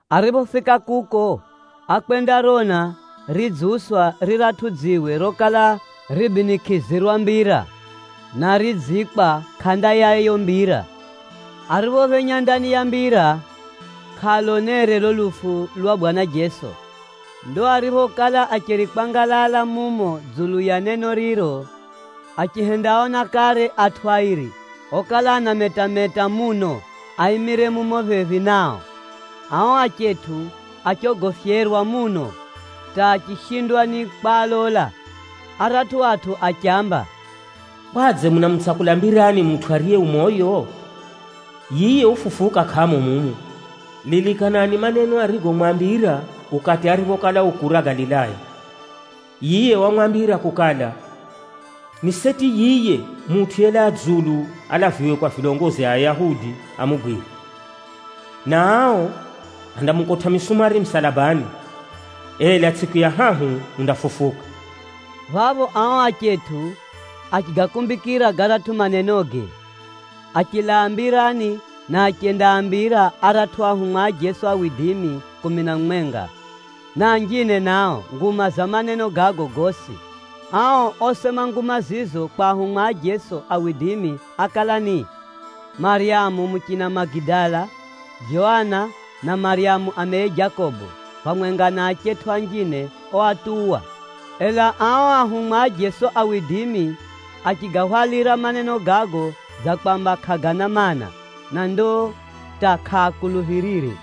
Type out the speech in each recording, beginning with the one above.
Ariphofika kuko, ákwendarona ridziuswa riratʼu dziwe rokala ribinikʼizirwa mbira, na ridziikwa kʼanda ya yiyo mbira. Ariphophenya ndani ya mbira, kʼaalonere lulo lufu lwa Bwana Jeso. Ndo ariphokala acheri kwangalala mumo dzulu ya neno riro, achihendaona kare atʼu airi okala anametameta muno aimire mumo phephi nao. Ao achetʼu achogofyerwa muno hata achishindwa ni kwalola. Aratʼu atʼu achiaamba, “Kwadze munamutsakula mbirani mutʼu ariye ucheri moyo? Yiye ufufuka kʼamo mumu. Lilikanani maneno arigomwambira ukati ariphokala u kura Galilaya. Yiye wamwambira kukala, ni seti yiye Mutʼu yelaa dzulu alaviwe kwa adambi amugwire, na ao andamukotʼa misumari musalabani, ela tsʼiku ya hahu undafufuka.” Phapho ao achetʼu achigakumbikira garatʼu manenoge, achilaa mbirani na achendaambira aratʼu anafunzi a Jeso kumi na mumwenga, na anjine nao nguma za maneno gago gosi. Ao osema nguma zizo kwa ahumwa a Jeso ákala ni: Maryamu muchina Magidala, Joana na Maryamu ameye Jakobo, phamwenga na achetʼu anjine oatuwa. Ela ao anafunzi a Jeso achigahwalira maneno gago dza kwamba kʼagana maana, na ndo hata kʼaakuluphirire.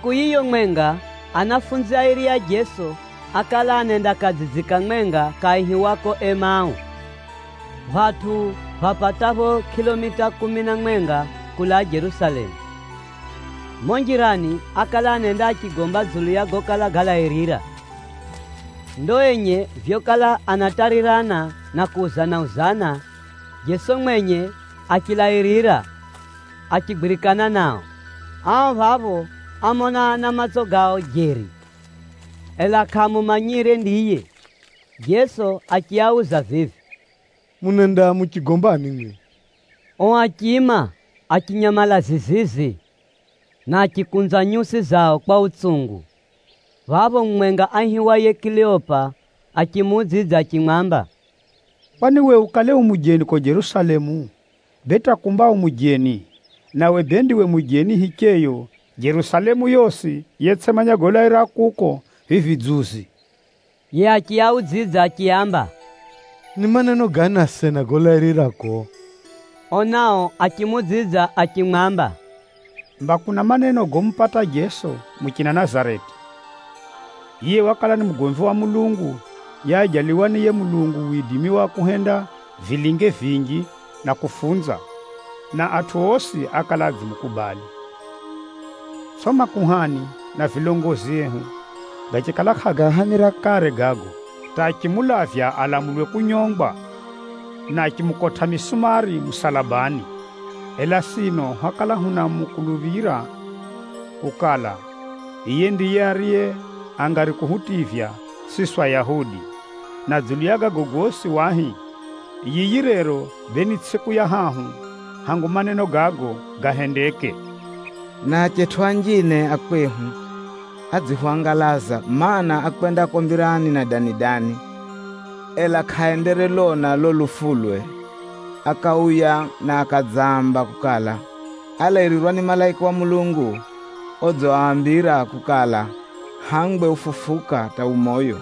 Tsʼiku yiyo mwenga, anafunzi airi a Jeso ákala anenda kadzidzi kamwenga kaihiwako Emau, phatʼu phapatapho kʼilomita kumi na mwenga kulaa Jerusalemu. Mumo njirani ákala anenda achigomba dzulu ya gokala galairira. Ndo enye vyokala anatarirana na kuuzana-uzana, Jeso mwenye achilairira achigwirikana nao. Ao phapho ámona na matso gao jeri, ela kʼaamumanyire ndiye. Jeso achiauza vivi, “Munenda muchigombani mwimwi?” Ao achiima, achinyamala zizizi, na achikunza nyusi zao kwa utsungu. Phapho mumwenga aihiwaye Kileopa achimuudzidza achimwamba, “Kwani we ukale u mujeni kuko Jerusalemu? Bee hata kumba u mujeni, nawe bee ndiwe mujeni hicheyo Jerusalemu yosi yetsʼimanya golairira kuko vivi dzuzi?” Yiye achiaudzidza achiaamba, “Ni maneno gani asena golairira kuko?” Ao nao achimuudzidza achimwamba, “Mba kuna maneno gomupata Jeso muchina Nazareti. Yiye wakala ni mugomvi wa Mulungu, yeajaliwa ni yiye Mulungu widimi wa kuhenda vilinge vinji na kufunza, na atʼu osi ákala adzimukubali. Tsʼo makuhani abomu na vilongozi ehu gachikala kʼagaahamira kare gago, hata achimulavya alamulwe kunyongwa, na achimukotʼa misumari musalabani. Ela sino hwakala hunamukuluphira kukala, yiye ndiye ariye angari kuhutivya siswi Ayahudi. Na dzulu ya gago gosi wahi, yiyi rero bee ni tsʼiku ya hahu hangu maneno gago gahendeke. Na achetʼu anjine a kwehu adzihwangalaza. Maana, ákwenda kuko mbirani na dani-dani, ela kʼenderelona lulo lufulwe. Akauya na akadzaamba kukala, álairirwa ni malaika a Mulungu odziambira kukala hangwe ufufuka hata ucheri moyo.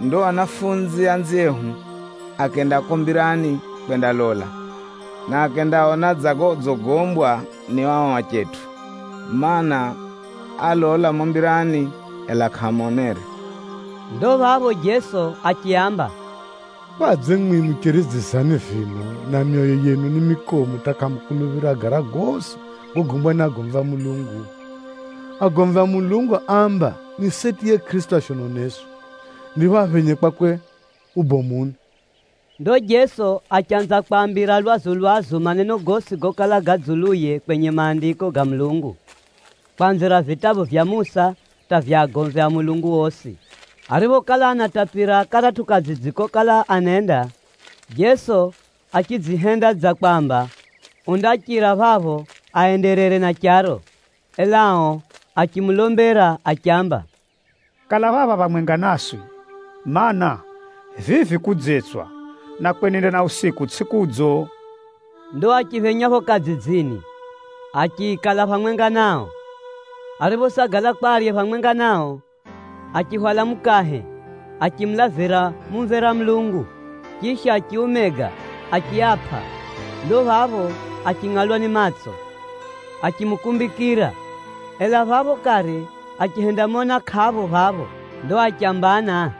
Ndo anafunzi anziehu akenda kuko mbirani kwendalola, na akendaona dza godzigombwa ni ao achetʼu, mana, álola mumo mbirani, ela kʼaamonere.” Ndo phapho Jeso achiaamba, “Kwadze mwimwi mucheri dzizani vino na myoyo yenu ni mikomu hata kʼamukuluphira gara gosi gogombwa ni agomvi a Mulungu? Agomvi a Mulungu áamba ni seti yiye Kʼirisito ashononeswe, ndipho aphenye kwakwe ubomuni!” Ndo Jeso achanza kwaambira lwazu-lwazu maneno gosi gokala ga dzuluye kwenye Maandiko ga Mulungu, kwanzira vitabu vya Musa hata vya agomvi a Mulungu osi. Ariphokala anatapira karatʼu kadzidzi kokala anenda, Jeso achidzihenda dza kwamba undachira phapho aenderere na charo, ela ao achimulombera achiamba, “Kala phapha phamwenga naswi, mana, vivi kudzetswa na kwenenda na usiku tsʼiko kudzo.” Ndo achiphenya phapho kadzidzini, achikala phamwenga nao. Ariphosagala kwa arye phamwenga nao, achihwala mukahe, achimulavira mumvera Mulungu, chisha achiumega achiapʼa. Ndo phapho achingʼalwa ni matso achimukumbikira. Ela phapho kare achihendamona kʼapho phapho. Ndo achambana,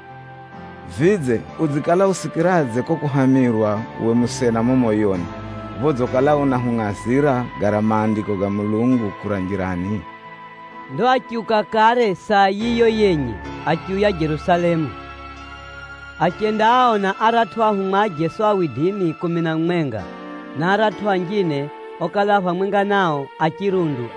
“Vidze, udzikala usikiradze kuko kuhamirwa uwe musena mumo moyoni, phodzikala unahungʼazira gara Maandiko ga Mulungu kura njirani?” Ndo achiuka kare saa yiyo yenye achiuya Jerusalemu. Achendaaona aratʼu ahumwa a Jeso kumi na mumwenga, na aratʼu anjine okala a phamwenga nao a chirundu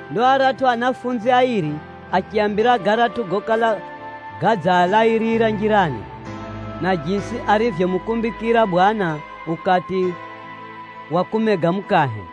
Ndo aratʼu anafunzi airi achiaambira garatʼu gokala gadzialairira njirani, na jisi arivyomukumbikira Bwana ukati wa kumega mukahe.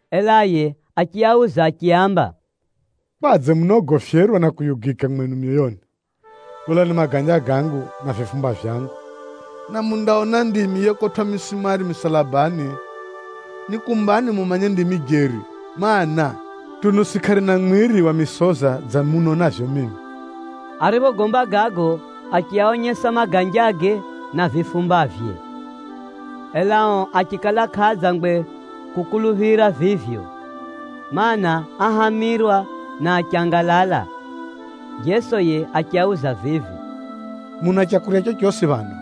Ela yiye achiauza achiaamba, “Kwadze munaogofyerwa na kuyugika mwenu myoyoni? Lolani maganja gangu na vifumba vyangu, na mundaona ndimi yekotwʼa misumari musalabani. Nikumbani mumanye ndimi jeri, mana, tunusi kʼarina mwiri wa misoza dza munonavyo mimi.” Ariphogomba gago, achiaonyesa maganjage na vifumbavye. Ela ao achikala kʼaadzangwe kukuluphira vivyo, mana, áhamirwa na achangalala. Jeso yiye achiauza vivi, “Muna leu rorosi phano?”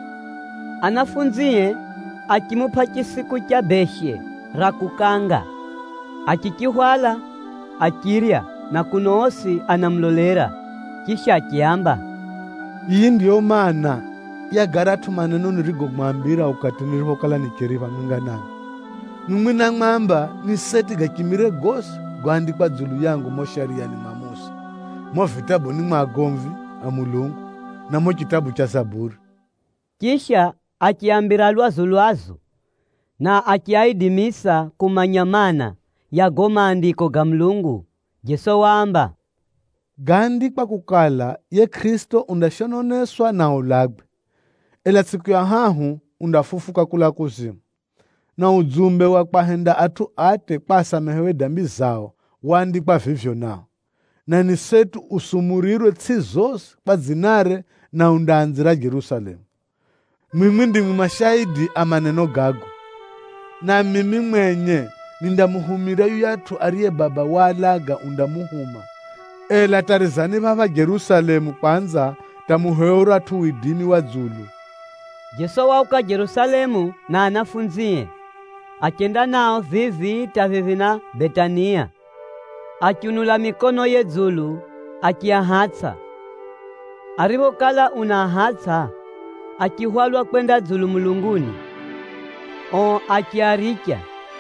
Anafunzie achimupʼa chisiku cha beshe ra kukanga. Achichihwala, achirya na kuno osi anamulolera. Chisha achiaamba, “Yiyi ndiyo maana, ya garatʼu maneno nirigomwambira ukati niriphokala nicheri phamwenga namwi. Mwimwi námwamba ni seti gachimire gosi goandikwa dzulu yangu mumo Shariyani mwa Musa, mumo vitabuni mwa agomvi a Mulungu, na mumo chitabu cha Zaburi.” Chisha achiaambira lwazu-lwazu, na achiaidimisa kumanya maana, ya gago Maandiko ga Mulungu. Jeso waamba, “Gáandikwa kukala yiye Kʼirisito undashononeswa na aulagwe, ela tsʼiku ya hahu undafufuka kulaa kuzimu. Na udzumbe wa kwahenda atʼu atye kwa asamehewe dambi zao waandikwa vivyo nao, na ni seti usumurirwe itsʼi zosi kwa dzinare, na undaanzira Jerusalemu. Mwimwi ndimwi mashaidi a maneno gago. Na mimi mwenye nindamuhumira yuyatʼu ariye Baba walaga undamuhuma, ela tarizani phapha Jerusalemu kwanza hata muhewe uratʼu widimi wa dzulu.” Jeso wauka Jerusalemu na anafunzie, achenda nao vivi hata phephi na Betania, achiunula mikonoye dzulu achiahatsʼa. Ariphokala unaahatsʼa, achihwalwa kwenda dzulu mulunguni, ao achiaricha.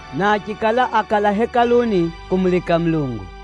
na achikala ákala Hekaluni kumulika Mulungu.